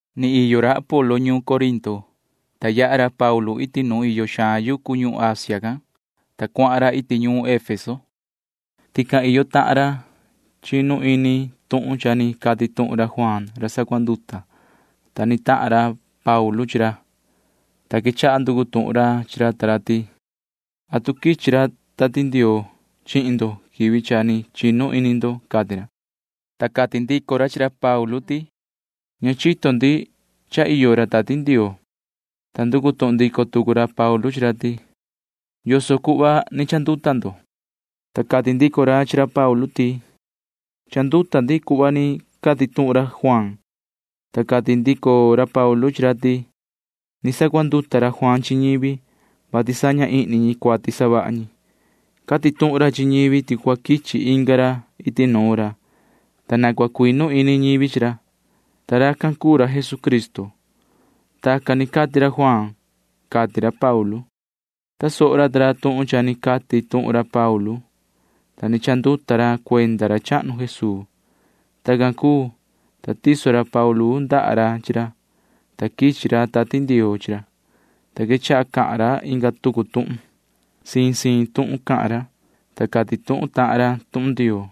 Ni iyo ra Apolo ñuun Corinto, ta yaha ra Paulu iti nu iyo xaan yucu ñuhun Asia can, ta cuahan ra iti ñuun Efeso. Tican iyo tahan ra chinu ni ini tuhun cha ni cati tuhun ra Juaan ra sacuanduta, ta ni tahan ra Paulu chi ra, ta quechaha nducu tuhun ra chi ra ta ra ti: ―¿Atu quichi ra Tati Ndioo chihin ndo quivi cha ni chinu ini ndo? ―cati ra. Ta cati ndico ra chi ra Paulu ti: ―Ña chito ndi cha iyo ra Tati Ndioo. Ta nducu tuhun ndico tucu ra Paulu chi ra ti: ―¿Yoso cuhva ni chanduta ndo? Ta cati ndico ra chi ra Paulu ti: ―Chanduta ndi cuhva ni cati tuhun ra Juaan. Ta cati ndico ra Paulu chi ra ti: ―Ni sacuanduta ra Juaan chi ñivi, vati saña ihni ñi cuati savaha ñi. Cati tuhun ra chi ñivi ti cua quichi inga rai iti nuun ra, ta na cua cuinu ini ñivi chi ra, ta racan cuu ra Jesucristo. Tacan ni cati ra Juaan ―cati ra Paulu. Tasoho ra ta ra tuhun cha ni cati tuhun ra Paulu, ta ni chanduta ra cuenda ra chahnu Jesuu. Tacan cuu, ta tiso ra Paulu ndaha ra chi ra, ta quichi ra Tati Ndioo chi ra, ta quechaha cahan ra inga tucu tuhun. Siin siin tuhun cahan ra, ta cati tuhun tahan ra tuhun Ndioo.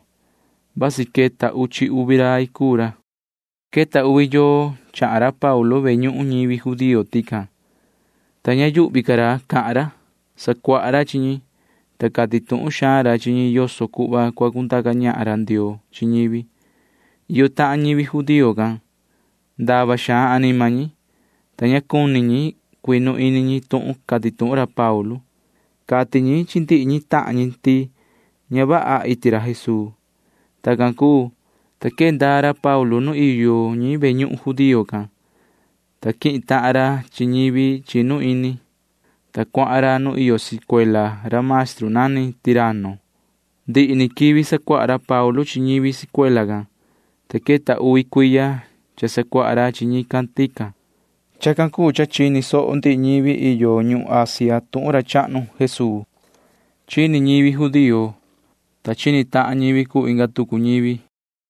Vasi queta uchi uvi rai cuu ra. Queta uvi yoo chahan ra Paulu ve ñuhun ñivi judío tican, ta ña yuhvi ra cahan ra. Sacuaha ra chi ñi, ta cati tuhun xaan ra chi ñi yoso cuhva cua cundaca ñahan ra Ndioo chi ñivi. Iyo tahan ñivi judío can―ndava xaan anima ñi, ta ña cuni ñi cuinu ini ñi tuhun cati ra Paulu. Cati ñi chi ndihi ñi tahan ñi ti ña vaha iti ra Jesuu. Tacan cuu, ta quee ndaa ra Paulu nu iyo ñi ve ñuhun judío can, ta quihin tahan ra chi ñivi chinu ini, ta cuahan ra nu iyo sicuela ra maestru nani Tiranno. Ndihi ni quivi sacuaha ra Paulu chi ñivi sicuela can, ta queta uvi cuiya cha sacuaha ra chi ñi tican. Chacan cuu cha chini soho ndihi ñivi iyo ñuhun Asia tuhun ra chahnu Jesuu. Chini ñivi judío, ta chini tahan ñivi cuu inga tucu ñivi.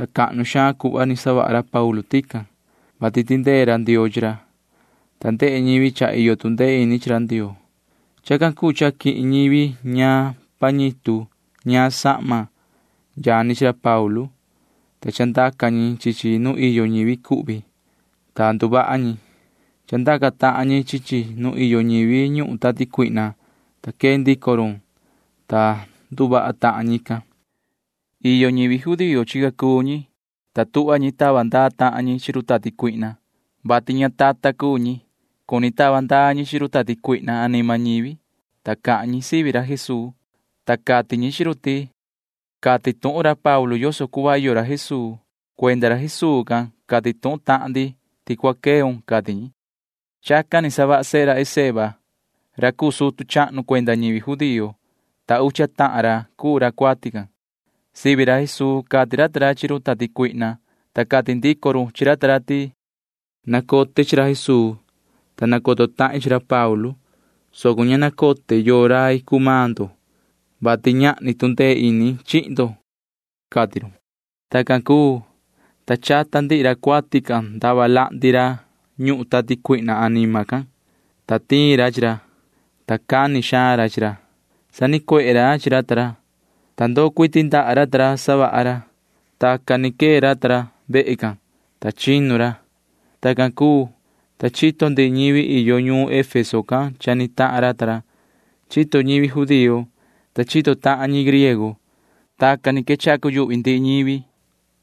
Cahnu xaan cuhva ni savaha ra Paulu tican, vati tindee ra Ndioo chi ra, ta ndehe ñivi cha iyo tu ndee ini chi ra Ndioo. Chacan cuu cha quihin ñivi ñaan pañitu ñaan sahma yani chi ra Paulu, ta chandaca ñi chi chi nu iyo ñivi cuhvi, ta nduvaha ñi. Chandaca tahan ñi chi chi nu iyo ñivi ñuhun tati cuihna anima, ta quee ndico run, ta nduvaha tahan ñican. Iyo ñivi judío chica cuu ñi, ta tuhva ñi tava ndaa tahan ñi chi run tati cuihna, vati ñatatan cuu ñi. Cuni tava ndaa ñi chi run tati cuihna anima ñivi, ta cahan ñi sivi ra Jesuu, ta cati ñi chi run ti: ―Cati tuhun ra Paulu yoso cuhva iyo ra Jesuu. Cuenda ra Jesuu can cati tuhun tahan ndi ti cua queun ―cati ñi. Chacan ni savaha sehe ra Esceva ra cuu sutu chahnu cuenda ñivi judío, ta ucha tahan ra cuu ra cuati can. Sivi ra Jesuu cati ra ta ra chi run tati cuihna, ta cati ndico run chi ra ti: ―Nacote chi ra Jesuu, ta nacoto tahin chi ra Paulu, soco ña nacote yoo rai cuu maan ndo, vati ñahni tu ndee ini chihin ndo ―cati run. Tacan cuu, ta chata ndihi ra cuati can ndava lahndi ra ñuhun tati cuihna anima can, ta tiin ra chi ra, ta cani xaan ra chi ra. Sanicuehe ra chi ra ta ra, ta ndoo cuiti ndaha ra ta ra savaha ra. Tacan ni quee ra ta ra vehe can, ta chinu ra. Tacan cuu, ta chito ndihi ñivi iyo ñuun Efeso can cha ni tahan ra ta ra. Chito ñivi judío, ta chito tahan ñi griego. Tacan ni quechaha cuyuhvi ndihi ñivi suhva,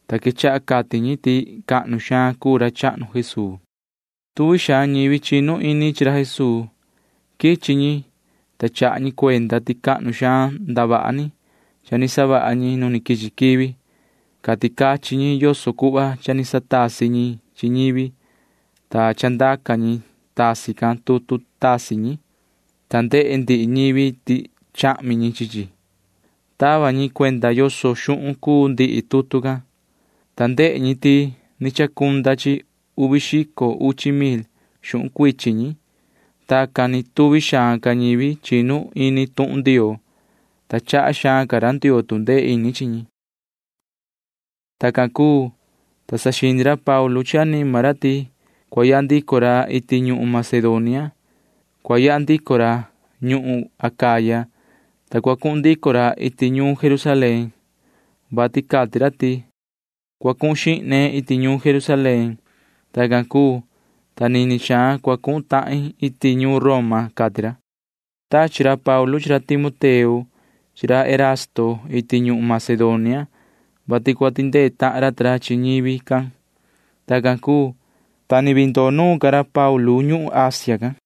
ta quechaha cati ñi ti cahnu xaan rai cuu ra chahnu Jesuu. Tuvi xaan ñivi chinu ini chi ra Jesuu. Quichi ñi, ta chaha ñi cuenda ti cahnu xaan ndavaha ni cha ni savaha ñi nu quichi quivi. Cati cachin ñi yoso cuhva cha ni satasi ñi chi ñivi, ta chandaca ñi tasi can tutu tasi ñi, ta ndehe ndihi ñivi ti chahmi ñi chi chi. Tava ñi cuenda yoso xuhun cuu ndihi tutu can, ta ndehe ñi ti ni chacunda chi uvi xico uchi mil xuhun cuichin ñi. Tacan ni tuvi xaan ca ñivi chinu ini tuhun Ndioo, ta chaha xaan ca ra Ndioo tu ndee ini chi ñi. Tacan cuu, ta saxini ra Paulu chi anima ra ti cua yaha ndico ra iti ñuhun Macedonia. Cua yaha ndico ra ñuhun Acaya, ta cua cuhun ndico ra iti ñuun Jerusalén, vati cati ra ti: ―Cua cuhun xihne iti ñuun Jerusalén. Tacan cuu, ta nini xaan cua cuhun tahin iti ñuun Roma ―cati ra. Tachi ra Paulu chi ra Timoteo chi ra Erasto iti ñuhun Macedonia, vati cua tindee tahan ra ta ra chi ñivi can. Tacan cuu, ta ni vii ndoo nuun ca ra Paulu ñuhun Asia can.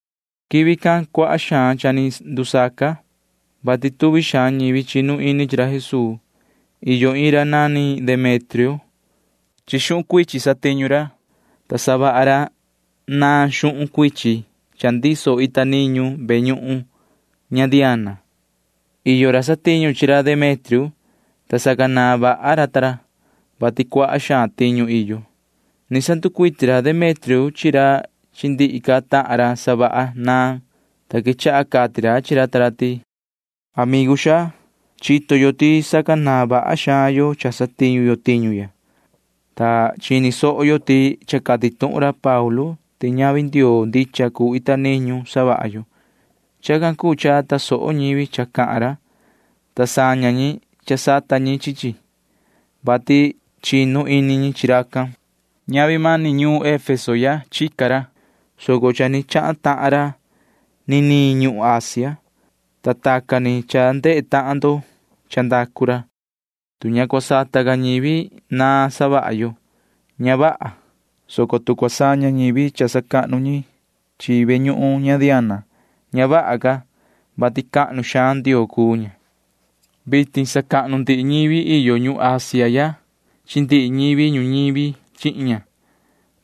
Quivi can cuaha xaan cha ni ndusaca, vati tuvi xaan ñivi chinu ini chi ra Jesuu. Iyo iin ra nani Demetrio. Xuhun cuichin satiñu ra, ta savaha ra naan xuhun cuichin cha ndiso ita niñu ve ñuhun ña Diana. Iyo ra satiñu chi ra Demetrio, ta sacanaan vaha ra ta ra, vati cuaha xaan tiñu iyo. Ni sanducuiti ra Demetrio chi ra chi ndihi ca tahan ra savaha naan, ta quechaha cati ra chi ra ta ra ti: ―Amigu xaa, chito yo ti sacanaan vaha xaan yo cha satiñu yo tiñu ya, ta cha chini soho yo ti cha cati tuhun ra Paulu ti ñavi ndioo ndicha cuu ita niñu savaha yo. Chacan cuu cha tasoho ñivi cha cahan ra, ta saña ñi sata ñi chi chi, vati chinu ini ñi chi racan. Ñavi mani ñuun Efeso ya chica ra, soco cha ni chahan tahan ra niniin ñuhun Asia, ta tacan ni cha ndehe tahan ndo cha ndacu ra. Tu ña cua sata ca ñivi naan savaha yo, ña vaha, soco tu cua saña ñivi cha sacahnu ñi chi ve ñuhun ña Diana, ña vaha ca, vati cahnu xaan ndioo cuu ña. Vitin sacahnu ndihi ñivi iyo ñuhun Asia ya chi ndihi ñivi ñuñivi chihin ña.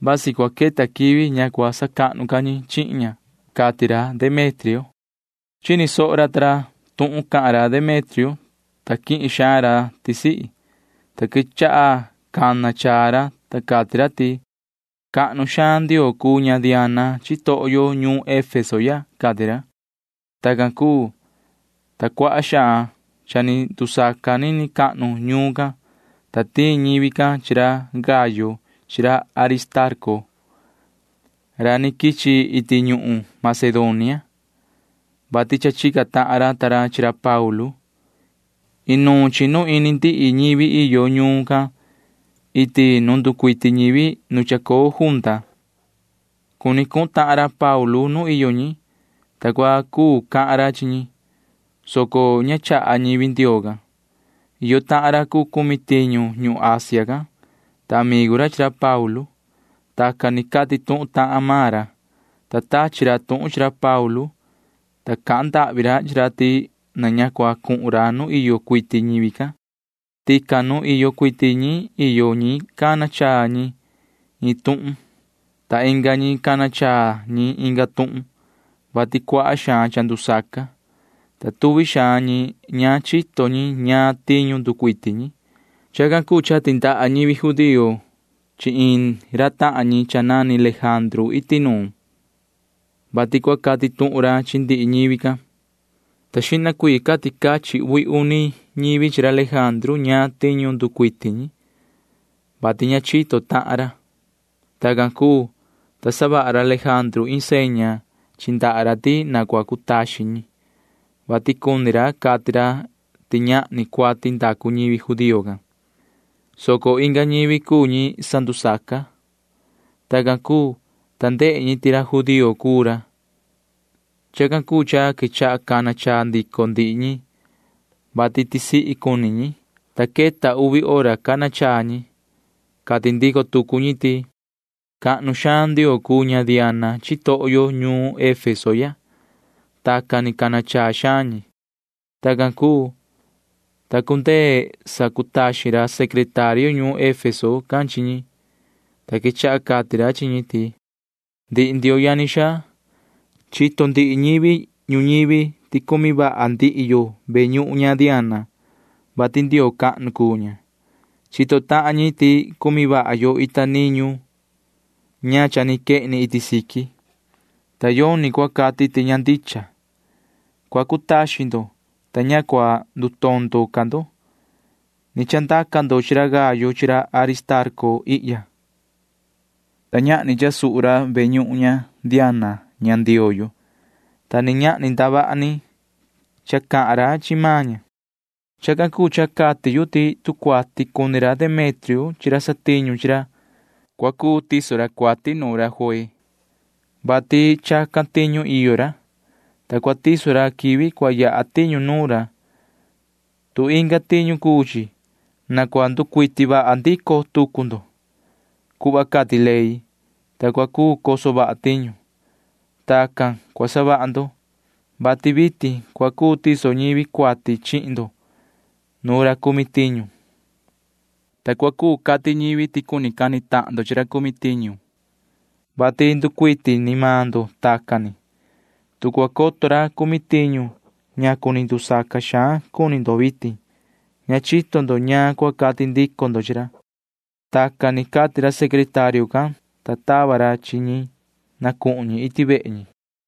Vasi cua queta quivi ña cua sacahnu ca ñi chihin ña ―cati ra Demetrio. Chini soho ra ta ra tuhun cahan ra Demetrio, ta quihin xaan ra tisihi, ta quechaha cana chaa ra, ta cati ra ti: ―Cahnu xaan ndioo cuu ña Diana chitoho yo ñuun Efeso ya ―cati ra. Tacan cuu, ta cuaha xaan cha ni ndusaca nini cahnu ñuun can, ta tiin ñivi can chi ra Gayo chi ra Aristarco ra ni quichi iti ñuhun Macedonia, vati cha chica tahan ra ta ra chi ra Paulu. Inuun chinu ndihi ñivi iyo ñuun can iti nu nducuiti ñivi nu chacoo junta. Cuni cuhun tahan ra Paulu nu iyo ñi, ta cua cu cahan ra chi ñi, soco ña chaha ñivi Ndioo can. Iyo tahan ra cuu cumi tiñu ñuhun Asia can, ta amigu ra chi ra Paulu. Tacan ni cati tuhun tahan maan ra, ta tachi ra tuhun chi ra Paulu, ta cahan ndahvi ra chi ra ti na ña cua cuhun ra nu iyo cuiti ñivi can. Tican nu iyo cuiti ñi iyo ñi cana chaa ñi iin tuhun, ta inga ñi cana chaa ñi inga tuhun, vati cuaha xaan cha ndusaca, ta tuvi xaan ñi ña chito ñi ñaan tiñu nducuiti ñi. Chacan cuu cha tindaha ñivi judío chi iin ra tahan ñi nani Lejandru iti nuun, vati cua cati tuhun ra chi ndihi ñivi can, ta xihna cuii cati cachin uvi uni ñivi chi ra Lejandru ñaan tiñu nducuiti ñi, vati ña chito tahan ra. Tacan cuu, ta savaha ra Lejandru iin seña chi ndaha ra ti na cua cutaxin ñi, vati cuni ra cati ra ti ñahni cuati ndacu ñivi judío can, soco inga ñivi cuu ñi sandusaca. Tacan cuu, ta ndehe ñi ti ra judío cuu ra. Chacan cuu cha quechaha cana chaa ndico ndihi ñi, vati tisihi cuni ñi, ta queta uvi hora cana chaa ñi. Cati ndico tucu ñi ti: ―Cahnu xaan ndioo cuu ña Diana chitoho yo ñuun Efeso ya. Tacan ni cana chaa xaan ñi. Tacan cuu, ta cundee sacutaxin ra secretario ñuun Efeso can chi ñi, ta quechaha cati ra chi ñi ti: ―Ndihi ndioho yani xaa, chito ndihi ñivi ñuñivi ti cumi vaha ndihi yo ve ñuhun ña Diana, vati ndioo cahnu cuu ña. Chito tahan ñi ti cumi vaha yo ita niñu ña cha ni quehni iti siqui, ta yoni cua cati ti ña ndicha. Cua cutaxin ndo, ta ña cua ndutondo ca ndo. Ni chandaca ndo chi ra Gayo chi ra Aristarco ihya, ta ñahni cha suhu ra ve ñuhun ña Diana ña ndioo yo, ta ni ñahni ndavaha ni cha cahan ra chi maan ña. Chacan cuu cha cati yu ti tu cuati cuni ra Demetrio chi ra satiñu chi ra, cua cuu tiso ra cuati nuun ra juee, vati chacan tiñu iyo ra, ta cua tiso ra quivi cua yaha tiñu nuun ra. Tu inga tiñu cuu chi, na cua nducuiti vaha ndico tucu ndo cuhva cati ley, ta cua cuu coso vaha tiñu. Tacan cua savaha ndo, vati vitin cua cuu tiso ñivi cuati chihin ndo nuun ra cumi tiñu, ta cua cuu cati ñivi ti cuni cani tahan ndo chi ra cumi tiñu, vati nducuiti ni maan ndo tacan ni. Tu cua coto ra cumi tiñu ñacu ni ndusaca xaan cuni ndo vitin, ña chito ndo ñaan cua cati ndico ndo chi ra. Tacan ni cati ra secretario can, ta tava ra chi ñi na cuhun ñi iti vehe ñi.